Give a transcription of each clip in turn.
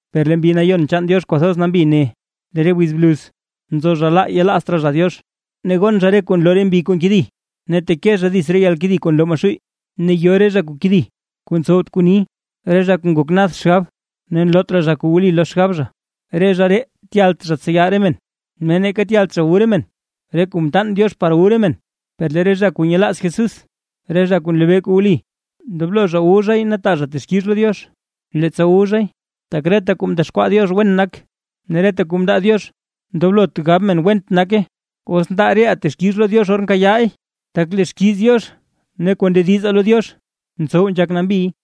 Per lee Mbi Nayon chaan Diox kwathoz nambi ne: Lee re wiz bluz, nzo zha laa yelaazt raa zha Diox. Ne gon zha re kuu nloo re mbi kuu nkedi, ne teke zha dits re yalkedi kuu nloo Maxuuy. Ne yo re zha kuu kedi kuu ntsowt kuu ni. Re zha kuu ngok nad xgab ne nloot raa kuu wli lo xgab zha. Re zha ree tyalt zha tseya re men, ne neeka tyalt zha wu re men re kuu mtaan Diox par wu re men. Per lee re zha kuu nyelaaz Jesús, re zha kuu nlebee kuu wli, ndoblo zha wu zhay ne taa zha texkix lo Diox leettsa wu zhay. Tak reta kuu mdexkwaa Diox wen nak, ne reta kuu mndaa Diox ndoblot gab men went nake, os ndaa reʼaa texkix lo Diox or nkayaa re leey, tak lee xkiiz Diox ne kuu ndedizaa lo Diox ntsow nzhak nambiy.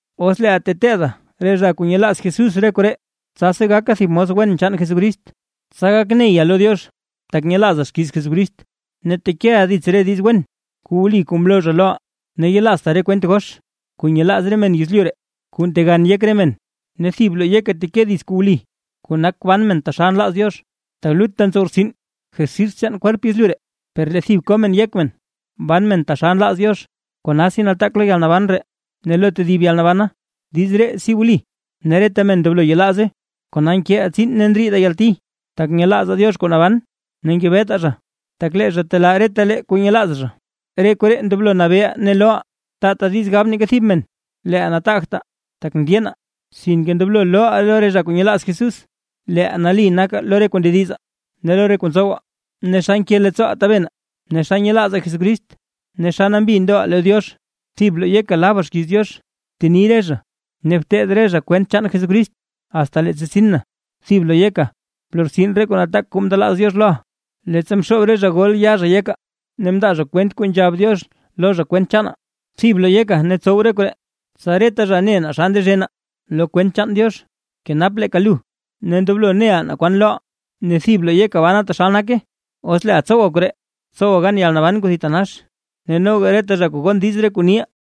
Os leeʼa teteeda re zha kuu nyelaaz Jesús re koree, tsasi gaka thib mos wen chaan Jesucrist. Tsa gak neya lo Diox tak nyelaaza xkiiz Jesucrist, ne tekeʼa dits re diiz wen kuu wli kuu mloo zha loʼa. Ne yelaazta re kwent gox kuu nyelaaz re men yezlyu ree, kuu ntegan yek re men. Ne thib bloo yeka bteke dits kuu wli, kuu nak ban men taxal nlaaz Diox. Tak lutta ntsow rtsin jersis chaan kwerp yezlyu ree, per lee thib ko men yek men ban men taxal nlaaz Diox, konasi nataak lo yalnaban ree ne lo tedib yalnabana. Diiz ree si wli, ne reta men ndoblo yelaaze. Kona nkeʼaa tsiin ne ndriidaa yalti, tak nyelaazaa Diox kuu naban ne ngebetaa zha, tak lee zha telaa retalee kuu nyelaaz zha. Re koree ndoblo nabeeʼa ne looʼa. Taata diiz gab neeka thib men leeʼa nataagta, tak ndyeena; sinke ndoblo looʼa lo re zha kuu nyelaaz Jesús, leeʼa nali naka lo re kuu ndediza, ne lo re kuu ntsowa, ne xa nke leettsooʼa tabena, ne xa nyelaaza Jesucrist ne xa nambi ndoʼa lo Diox. Thibka bloo yeka laba xkiiz Diox, bteni re zha, ne bteteed re zha kwent chaan Jesucrist asta leettsa tsin na. Thibka bloo yeka blortsin re kuu nataak kuu mndelaaz Diox loʼa, leettsa mxoob re zha gol yaa zha yeka, ne mndaa zha kwent kuu nzhab Diox lo zha kwent chaana. Thib bloo yeka ne btsow re koree, tsa reta zha ne naa xa ndezhena lo kwent chaan Diox. Bkenapa leeka lu, ne ndoblo neʼa naa kwan looʼa, ne thib bloo yeka bana taxal nake. Os leeʼa tsowa koree, tsowa gan yalnaban kuu thitanax ne noga reta zha kuu gon diiz re kuu niʼa.